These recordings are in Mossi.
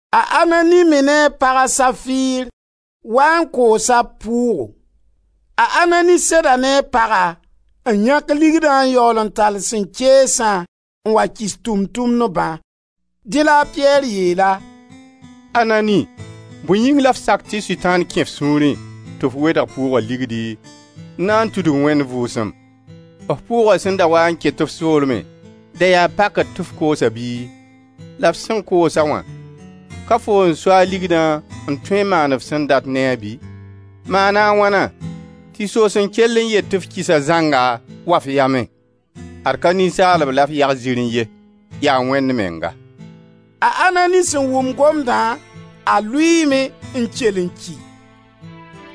A Anani me ne a pag, a Safir, waa n koosa b pʋʋgo. A Anani seda ne a paga n yãk ligdã n yaool n tall sẽn keesã n wa kɩs Tʋʋm-tʋmdbã. Dẽ la a Piyɛr yeel-a: «Anani, bõe yĩng la f sak tɩ Sʋtãan kẽ f sũurẽ tɩ f wedg pʋʋga ligdi n na n tudg Wẽnd Vʋʋsem? F Pʋʋga sẽn da waa n ket f soolmẽ, da yaa pakr tɩ f koos-a bɩ? La f sẽn koos-a wã, ka foo n so a ligdã n tõe n maan f sẽn dat ne-a bɩ? Maana a wãna tɩ soos n kell n yet tɩ kɩsa zãnga waa f yamẽ? Ad ka ninsaalb la f yag zirẽ ye, yaa Wẽnd menga.» A Anani sẽn wʋm gomdã, a lʋɩɩme n kell n ki.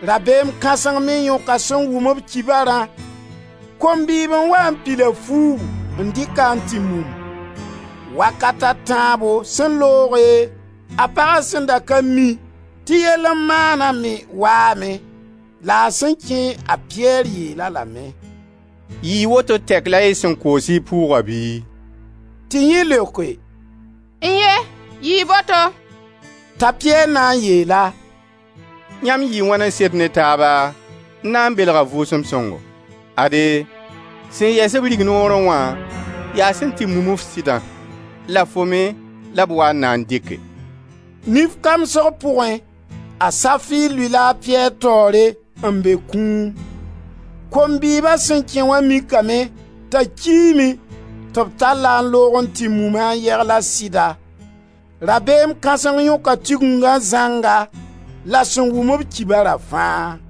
Rabeem kãseng me yõka sẽn wʋm-b kibarã. Kom-bɩɩb n wa n pil-a fuugu n dɩk-a n tɩ mum. Wakat a tãabo sẽn looge, a paga sẽn da ka mi tɩ yell n maana me waame, la a sẽn kẽ, a Piyɛr yeel-a lame: «Yɩɩ woto tɛk la y sẽn koos y pʋʋga bɩ?» Tɩ yẽ leoke: «N-ye! Yɩɩ boto.» T'a Piyɛr na n yeel-a: «Yãmb yɩɩ wãn n sed ne taaba, n na n belg a Vʋʋsem Sõngo? Ade, sẽn yɛs-b rignoorẽ wã yaa sẽn tɩ mum-f sɩdã, la fo me la b waa n na n dɩke.» Nif kamsg pʋgẽ, a Anani lʋɩ-la a Piyɛr taoore n be kũum. Kom-bɩɩba sẽn kẽ wã mikame t'a kiime tɩ b tall-a n loog n tɩ mum-a n yegl a sɩda. Rabeem kãseng yõka Tigingã zãnga la sẽn wʋm-b kibara fãa.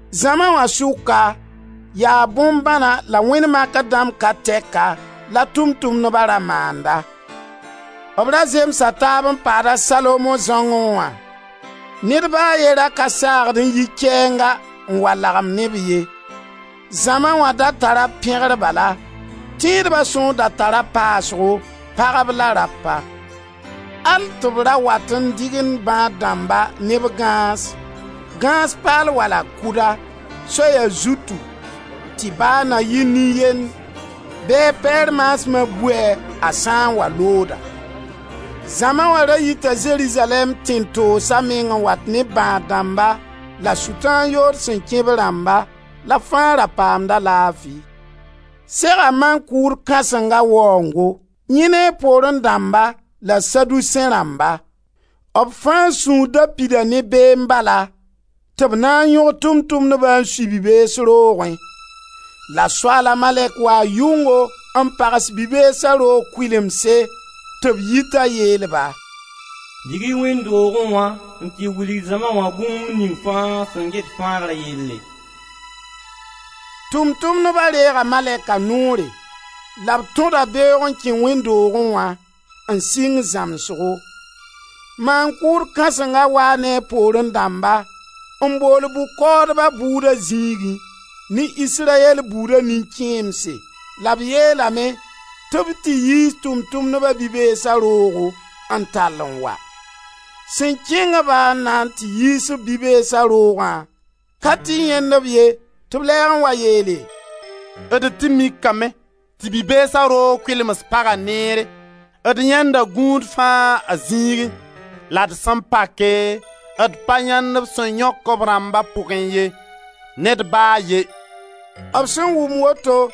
Zãma wã sʋka, yaa bõn-bãna la wẽnd makr dãmb ka tɛka la Tʋʋm-tʋmdba ra maanda. B ra zemsa taab n paad a Salomo zãongẽ wã. Ned ba a ye ra ka saagd n yi kɛɛnga n wa lagem ne-b ye. Zãma wã da tara b pẽgr bala. Tẽedba sõor da tara paasgo, pagb la rapa, al tɩ b ra wat n dɩgend bãad-dãmba ne b gãas, gãas paal wala kʋda, soya zutu, tɩ ba na yɩ nin-yend, bɩ a Piyɛr maasma bui-a a sã n wa looda. Zãma wã ra yita Zerizalɛɛm tẽn-toosa meng n wat ne b bãad-dãmba la Sʋtãan yood sẽn kẽ b rãmba la b fãa ra paamda laafi. Sega maan-kʋʋd kãsenga waoongo, yẽ ne a poorẽ dãmba la Saduseẽ rãmba. Fãa sũur da pida ne beem bala, tɩ b na n yõg Tʋʋm-tʋmdba n sui bi-bees roogẽ. La Soaala malɛk waa yʋngo n pags bi-beesa roog kʋɩlemse tɩ b yi t'a yeel-ba: «Dig-y wẽnd doogẽ wã n tɩ wilg zãma wã bũmb ning fãa sẽn get fãagra yelle.» Tʋʋm-tʋmdba reega malɛka noore la b tõda beoog n kẽ wẽnd doogẽ wã, n sɩng zãmsgo. Tʋʋm-tʋmdba bʋʋdo Maan-kʋʋd kãsenga waa ne a poorẽ dãmba, n bool bʋ-kaoodba bʋʋda zĩigẽ, ne Israyɛl buuda nin-kẽemse la b yeelame tɩ b tɩ yiis Tʋʋm-tʋmdba bi-beesa roogo n tall n wa. Sẽn kẽng-ba n na tɩ yiis-b bi-beesa roogã ka tɩ yãend-b ye tɩ b lɛɛg n wa yeele: «D tɩ mikame tɩ bi-beesa roog kʋɩlens paga neere, d yãenda gũud fãa a zĩigẽ. La d sẽn pake d pa yãend b sẽn yõk b rãmba pugẽ ye; ned ba a ye.» B sẽn wʋm woto,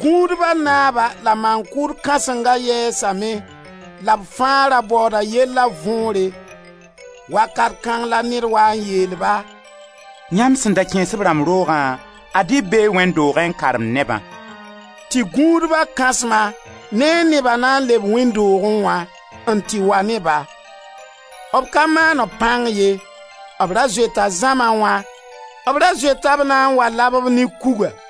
gũudba naaba la maan-kʋʋd kãsenga yɛɛsame la b fãa ra baooda yella võore. Wakat kãng la ned waa n yeel-ba: «Yãmb sẽn da kẽes b rãmb roogã, ad-y b bee wẽnd doogẽ n karemd nebã.» Tɩ gũudba kãsma ne a neba na n leb wẽnd doogẽ wã, n tɩ wa ne-ba. B ka maan b pãng ye; b ra zoeta zãma wã, b ra zoeta b na n wa lab-b ne kuga.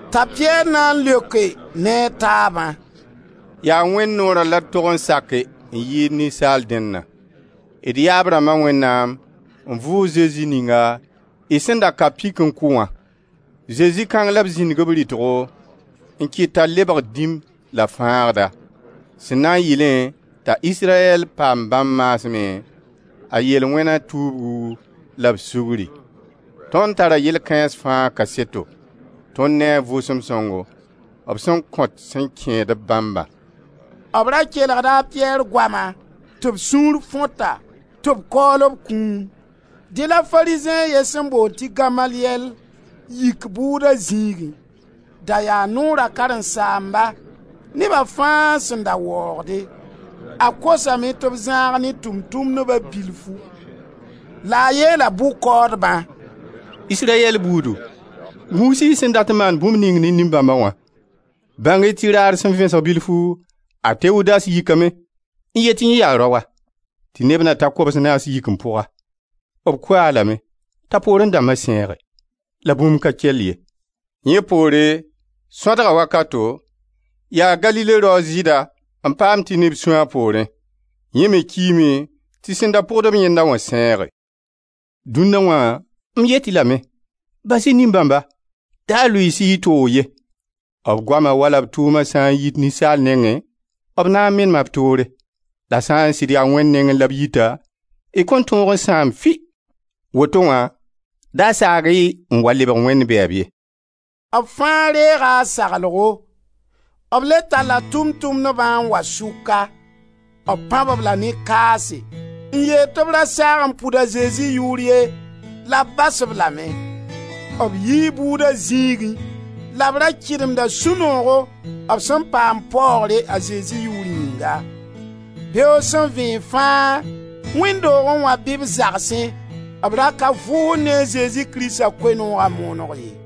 Ta Piyɛr na n leoke ne a taabã: «Yaa Wẽnd noora la d tog n sake n yɩɩd ninsaal dẽnna. D yaab rãmba Wẽnnaam n vʋʋg Zesi ninga y sẽn da ka pik n kʋ wã. Zezi kãng la b zĩndg b rɩtgo n kɩt t'a lebg Dĩm la Fãagda, sẽn na n yɩlẽ t'a Israyɛl paam, bãmb maasmẽ, a yel-wẽna tuubgu la b sugri. Tõnd tara yell kãens fãa kaseto, tõnd ne a Vʋʋsem Sõngo, b sẽn kõt sẽn kẽed-b bãmbã.» B ra kelgda a Piyɛr goama tɩ b sũur fõta, tɩ b kaool b kũum. Dẽ la Farizẽ a ye sẽn boond tɩ Gamaliyɛl yik bʋʋda zĩigẽ. Da yaa Noora karen-saamba, neba fãa sẽn da waoogde. A kosame tɩ b zãag ne Tʋʋm-tʋmdba bilfu, la a yeela bʋ-kaoodbã: «Israyɛl buudu, gũus-y y sẽn dat n maan bũmb ning ne nin-bãmba wã. Bãng-y tɩ raar sẽn vẽsg bilfu a Tewudas yikame n yet tɩ yẽ yaa raoa, tɩ neb na ta kobs-naas yik n pʋg-a. B kʋ-a lame t'a poorẽ dãmba sẽege, la bũmb ka kell ye. Yẽ poore, sõadga wakato, yaa Galile rao a Zɩɩda, n paam tɩ neb sũ a poorẽ. Yẽ me kiime tɩ sẽn da pʋgd-b yẽnda wã sẽege. Dũnna wã, m yet-y lame, bas-y nin-bãmba, da lʋɩɩs-y y toog ye. B goama wala b tʋʋma sã n yit ninsaal nengẽ, b na n menema b toore. La sã n sɩd yaa Wẽnd nengẽ la b yita, y kõn tõog n sãam fɩ. Woto wã da saag-y n wa lebg Wẽnd bɛɛb ye.» Fãa reega a saglgo. B le talla Tʋʋm-tʋmdbã n wa sʋka. B pãb-b la ne kaase, n yeel tɩ b ra saag n pʋd a Zezi yʋʋr ye la b bas-b lame. B yii bʋʋda zĩigẽ la b ra kɩdemda sũ-noogo b sẽn paam paoogre a Zezi Yʋʋr yĩnga. Beoog sẽn vẽeg fãa, wẽnd doogẽ wã bɩ b zagsẽ, b ra ka vʋʋsd ne a Zezi Krista Koe-nooga mooneg ye.